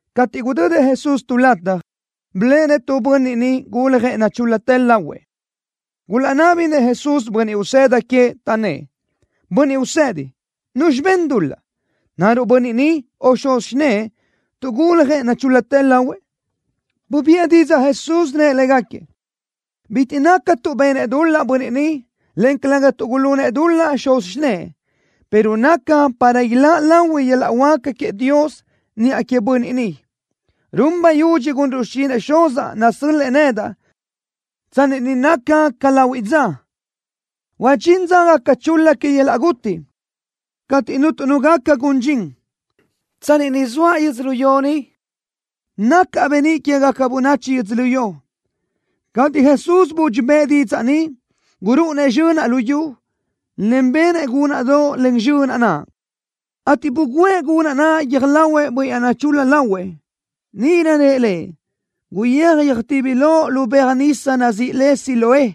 Cateʼ gudödëʼ Jesús tu lataj, biléʼenëʼ tu bönniʼ niʼ guljëʼ nachúl-latë lahuëʼ. Gulaʼnábinëʼ Jesús bönniʼ usëda queëʼ, taʼnnë́ʼ: —Bönniʼ Usedi, ¿nuzxi ben dul-laʼ? ¿Naruʼ bönniʼ ni o xuz xinë́ʼë tuʼ guljëʼ nachúl-latë lahuëʼ? Bubiʼë didzaʼ Jesús, rëʼ légaquiëʼ: —Bitiʼ naca tuʼ benëʼ dul-laʼ bönniʼ ni, en calëga tuʼ gulunëʼ dul-laʼ xuz xinë́ʼë, pero naca para iláʼ lahui yöl-laʼ huáca queëʼ Dios niʼa queëʼ bönniʼ ni. Run bayudxi gunruʼ xichinëʼ Xuzaʼ nasö́l-lëʼë nedaʼ, tsanni ni naca ca lahuiʼ dza. Huadxín dza gaca chul-la que yöl-laʼ guti, cateʼ cuntu nu gaca gun dxin. Tsanni ni zoaʼ yödzölió ni, nacaʼ beníʼ quégaca bönachi yödzölió. Cateʼ Jesús budxi bëʼë didzaʼ ni, gurúʼunëʼ zxönaʼ lu yu, en benëʼ gúnaʼdoʼ len zxönaʼ naʼ, ateʼ buguʼë gunaʼ naʼ guiö́j lahuëʼ bönniʼ naʼ nachul-la lahuëʼ. Níʼirö rëʼ lëʼ: —Guyéaj yöjtibi loʼ lu beaj nisa nazíʼi le Siloé.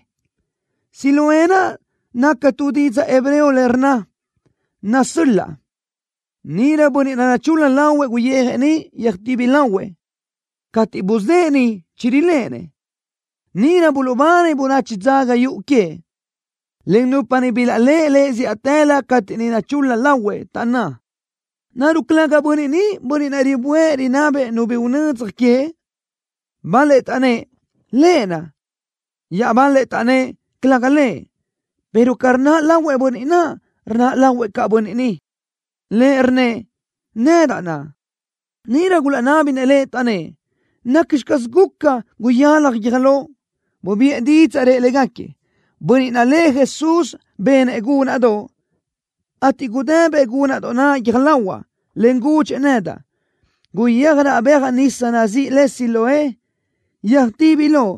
Siloé naca tu didzaʼ hebreo le rnna: Nasöl-laʼ. Níʼirö bönniʼ naʼ nachul-la lahuëʼ guyijëʼ niʼ, yöjtibi lahuëʼ. Cateʼ buzë́ʼë niʼ chiriléʼenëʼ. Níʼirö buluʼbani bönachi dzaga yuʼu queëʼ, en nupa niʼ bilaʼléʼe lëʼ zíʼatëlö cateʼ niʼ nachul-la lahuëʼ, taʼnná: —¿Naruʼ calëga bönniʼ ni bönniʼ naʼ riböʼë rinabëʼ nu bi unödzaj queëʼ? Bal-lëʼ taʼnnë́ʼ: —Lëʼ naʼ. Iaʼbal-lëʼ taʼnnë́ʼ: —Calëga lëʼ, pero ca rnaʼ lahuëʼ bönniʼ naʼ, rnaʼ lahuëʼ caʼ bönniʼ ni. Lëʼ rnnëʼ: —Nedaʼ naʼ. Níʼirö gulaʼnábinëʼ lëʼ, taʼnnë́ʼ: —¿Nacxi caz guca, guyalaj guiö́j loʼ? Bubiʼë didzaʼ, rëʼ légaquiëʼ: —Bönniʼ naʼ lëʼ Jesús benëʼ gúnaʼdoʼ, ateʼ gudëbëʼ gúnaʼdoʼ naʼ guiö́j lahuaʼ, en gudxëʼ nedaʼ: “Guyéaj raʼ beaj nisa nazíʼi le Siloé, yöjtibi loʼ.”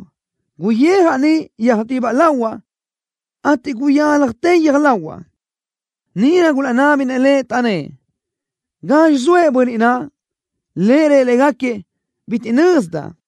Guyijaʼ niʼ, yöjtibi lahuaʼ, ateʼ guyálajtë guiö́j lahuaʼ. Níʼirö gulaʼnábinëʼ lëʼ, taʼnnë́ʼ: —¿Gazxi zoëʼ bönniʼ naʼ? Lëʼ rëʼ légaquiëʼ: —Bitiʼ nözdaʼ.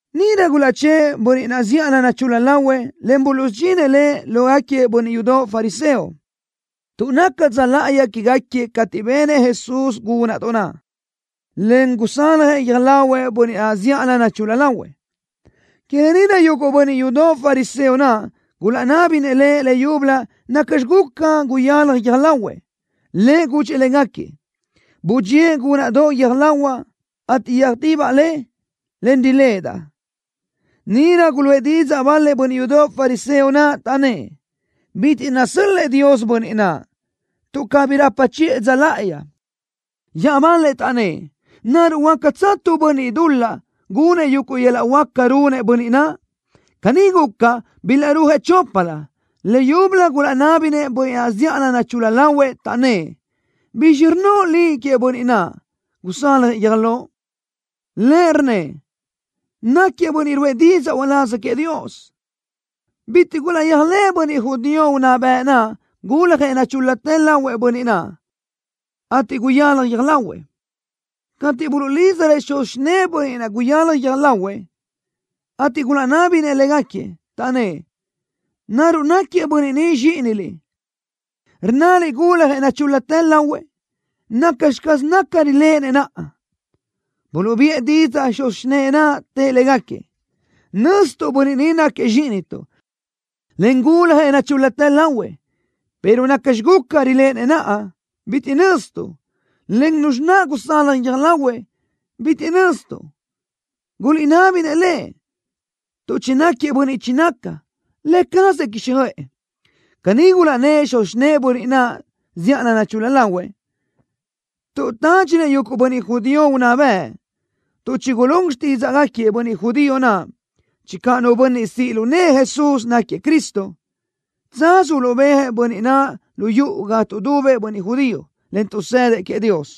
Níʼirö gulaʼchë́ʼë bönniʼ naʼ zíʼalö nachul-la lahuëʼ, en buluʼsudxinëʼ lëʼ lógaquiëʼ bönniʼ yudoʼ fariseo. Tuʼ naca dza láʼayi quégaquiëʼ cateʼ benëʼ Jesús gúnaʼdoʼ naʼ, en gusaljëʼ guiö́j lahuëʼ bönniʼ naʼ zíʼalö nachul-la lahuëʼ, que lë ni naʼ yuguʼ bönniʼ yudoʼ fariseo naʼ gulaʼnábinëʼ lëʼ leyúbölö nacxi guca guyalaj guiö́j lahuëʼ. Lëʼ gudxëʼ légaquiëʼ: —Budxíëʼ gúnaʼdoʼ guiö́j lahuaʼ, ateʼ yöjtibaʼ le, en riléʼedaʼ. Níʼirö guluʼë didzaʼ bal-lëʼ bönniʼ yudoʼ fariseo naʼ, taʼnnë́ʼ: —Bitiʼ nasöl-lëʼ Dios bönniʼ naʼ, tuʼ cabí rapa chiʼë dza láʼayi. Iaʼbal-lëʼ taʼnnë́ʼ: —¿Naruʼ huácatsö tu bönniʼ dul-laʼ gunëʼ yuguʼ yöl-laʼ huáca runëʼ bönniʼ naʼ? Caní guca, bilaʼrúajëʼ choplö. Leyúbölö gulaʼnábinëʼ bönniʼ naʼ zíʼalö nachul-la lahuëʼ, taʼnnë́ʼ: —¿Bizxi rnnoʼ liʼ queëʼ bönniʼ naʼ, gusaljëʼ guiö́j loʼ? Lëʼ rnnëʼ: —Náquiëʼ bönniʼ ruʼë didzaʼ uláz queëʼ Dios. Bitiʼ gulaʼyéajlëʼë bönniʼ judío unná bëʼ naʼ guljëʼ nachúl-latë lahuëʼ bönniʼ naʼ, en guyalaj guiö́j lahuëʼ, cateʼ buluʼlídzarëʼ xuz xinë́ʼë bönniʼ naʼ guyalaj guiö́j lahuëʼ, ateʼ gulaʼnábinëʼ légaquiëʼ, taʼnnë́ʼ: —¿Naruʼ náquiëʼ bönniʼ ni zxíʼiniliʼ, rnnaliʼ guljëʼ nachúl-latë lahuëʼ? ¿Nacxi caz naca riléʼenëʼ naʼa? Buluʼbiʼë didzaʼ xuz xinë́ʼë naʼ, tëʼ légaquiëʼ: —Nö́zituʼ bönniʼ ni náquiëʼ zxíʼinituʼ, en guljëʼ nachúl-latë lahuëʼ, pero nacxi guca, riléʼenëʼ naʼa, bitiʼ nöztuʼ, en nuzxi naʼ gusalaj guiö́j lahuëʼ, bitiʼ nöztuʼ. Guliʼnabi-nëʼ lëʼ, tuʼ chináquiëʼ bönniʼ chinaca. Lë cazëʼ quíxjöʼë. Caní gulaʼnnë́ʼ xuz xinë́ʼë bönniʼ naʼ zíʼalö nachul-la lahuëʼ, tuʼ tádxinëʼ yuguʼ bönniʼ judío unná bëʼ, tuʼ chigulún xtídzaʼgaquiëʼ bönniʼ judío naʼ channö nu bönniʼ siʼ lu nëʼë Jesús náquiëʼ Cristo, tsaz uluʼbéajëʼ bönniʼ naʼ lu yuʼu ga tuʼdubëʼ bönniʼ judío, en tuʼsëdëʼ queëʼ Dios.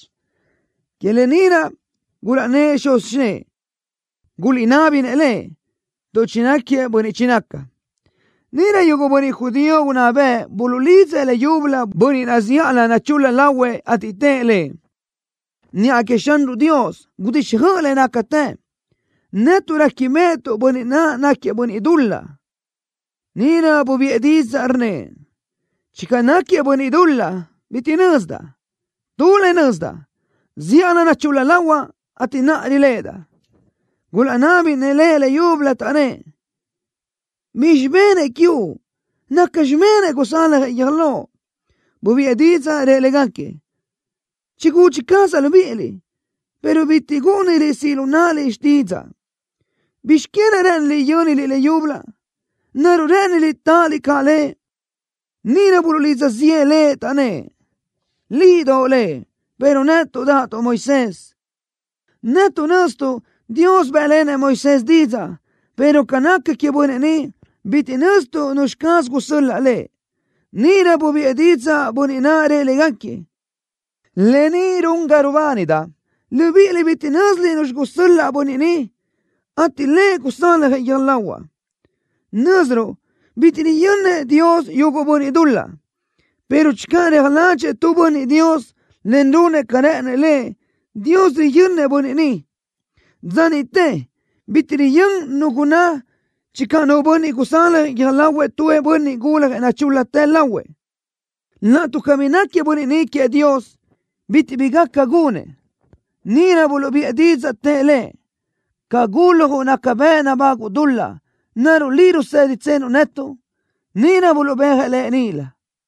Que lë ni naʼ gulaʼnnë́ʼ xuz xinë́ʼë: “Guliʼnabi-nëʼ lëʼ, tuʼ chináquiëʼ bönniʼ chinaca.” Níʼirö yuguʼ bönniʼ judío unná bëʼ buluʼlidzëʼ leyúbölö bönniʼ naʼ zíʼalö nachul-la lahuëʼ, ateʼ tëʼ lëʼ: —Niʼa queëʼ Xanruʼ Dios gudixjöʼ le nácatë. Netuʼ réquibeʼetuʼ bönniʼ naʼ náquiëʼ bönniʼ dul-laʼ. Níʼirö bubiʼë didzaʼ, rnnëʼ: —Channö náquiëʼ bönniʼ dul-laʼ bitiʼ nözdaʼ. Tu le nözdaʼ. Zíʼalö nachul-la lahuaʼ, ateʼ naʼa riléʼedaʼ. Gulaʼnábinëʼ lëʼ leyúbölö, taʼnnë́ʼ: —¿Bizxi benëʼ quiuʼ? ¿Nacxi benëʼ gusaljëʼ guiö́j loʼ? Bubiʼë didzaʼ, rëʼ légaquiëʼ: —Chigúdxi cazaʼ libíʼiliʼ, pero bitiʼ gúʼuniliʼ siʼ lu náʼaliʼ xtídzaʼa. ¿Bizx que naʼ rë́ʼëniliʼ yö́niliʼ leyúbölö? ¿Naruʼ rë́ʼëniliʼ táʼaliʼ caʼ Lëʼ? Níʼirö buluʼlidza ziʼë lëʼ, taʼnnë́ʼ: —Liʼ doʼo Lëʼ, pero netuʼ dáʼatuʼ Moisés. Netuʼ nöztuʼ Dios bë́ʼlenëʼ Moisés didzaʼ, pero ca naca queëʼ bönniʼ ni, bitiʼ nöztuʼ nuzxi caz gusöl-laʼ Lëʼ. Níʼirö bubiʼë didzaʼ bönniʼ naʼ, rëʼ légaquiëʼ: —Lë ni run ga rubánidaʼ. Libíʼiliʼ bitiʼ nö́ziliʼ nuzxi gusöl-laʼ bönniʼ ni, ateʼ Lëʼ gusaljëʼ guiö́j lahuaʼ. Nö́ziruʼ bitiʼ riyönnëʼ Dios yuguʼ bönniʼ dul-laʼ, pero channö reaj ládxëʼë tu bönniʼ Dios, en runëʼ ca rë́ʼënëʼ Lëʼ, Dios riyönnëʼ bönniʼ ni. Dza niʼte bitiʼ riyö́n nu gunná channö nu bönniʼ gusaljëʼ guiö́j lahuëʼ tu bönniʼ guljëʼ nachúl-latë lahuëʼ. Laʼtuʼ cabí náquiëʼ bönniʼ ni queëʼ Dios, bitiʼ bi gaca gunëʼ. Níʼirö buluʼbiʼë didzaʼ, tëʼ lëʼ: —Ca guljuʼ naca bëʼ nabáguʼu dul-laʼ. ¿Naruʼ liʼ ruséditsenuʼ netuʼ? Níʼirö buluʼbéajëʼ lëʼ níʼilö.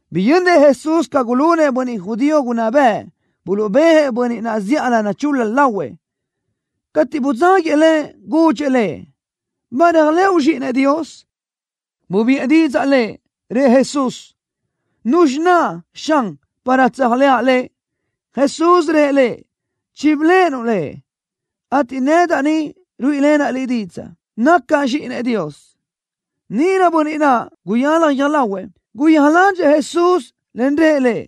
Biyönnëʼ Jesús ca gulunëʼ bönniʼ judío unná bëʼ, buluʼbéajëʼ bönniʼ naʼ zíʼalö nachul-la lahuëʼ. Cateʼ budzáguëʼ lëʼ, gudxëʼ lëʼ: —¿Ba réajlëʼu Zxíʼinëʼ Dios? Bubiʼë didzaʼ lëʼ, rëʼ Jesús: —¿Nuzxi naʼ, Xan, para tséajlëʼa Lëʼ? Jesús rëʼ lëʼ: —Chibiléʼenuʼ Lëʼ, ateʼ nedaʼ ni ruíʼilenaʼ liʼ didzaʼ, nacaʼ Zxíʼinëʼ Dios. Níʼirö bönniʼ naʼ, guyalaj guiö́j lahuëʼ, guyéaj ládxëʼë Jesús, en rëʼ Lëʼ: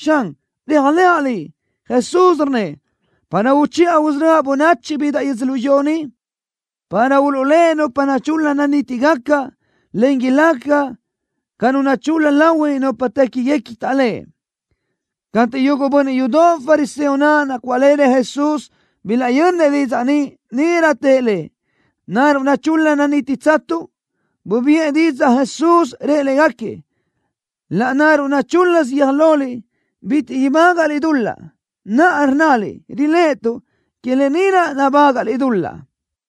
—Xan, réajlëʼa Liʼ. Jesús rnnëʼ: —Para uchiʼa usörö́aʼ bönachi bidaʼ yödzölió ni, para uluʼléʼe nupa nachul-la nanítigaca, en ilaca ca nu nachul-la lahui nupa téquiguequi taʼléʼe. Cateʼ yuguʼ bönniʼ yudoʼ fariseo naʼ nacuáʼlenëʼ Jesús bilaʼyönnëʼ didzaʼ ni, níʼirö tëʼ Lëʼ: —¿Naruʼ nachul-la nanítitsatuʼ? Bubiʼë didzaʼ Jesús, rëʼ légaquiëʼ: —Laʼnáruʼ nachúl-lasö guiö́j loliʼ, bitiʼ ibágaʼliʼ dul-laʼ. Naʼa rnnaliʼ: “Riléʼetuʼ.” Que lë ni naʼ nabágaʼliʼ dul-laʼ.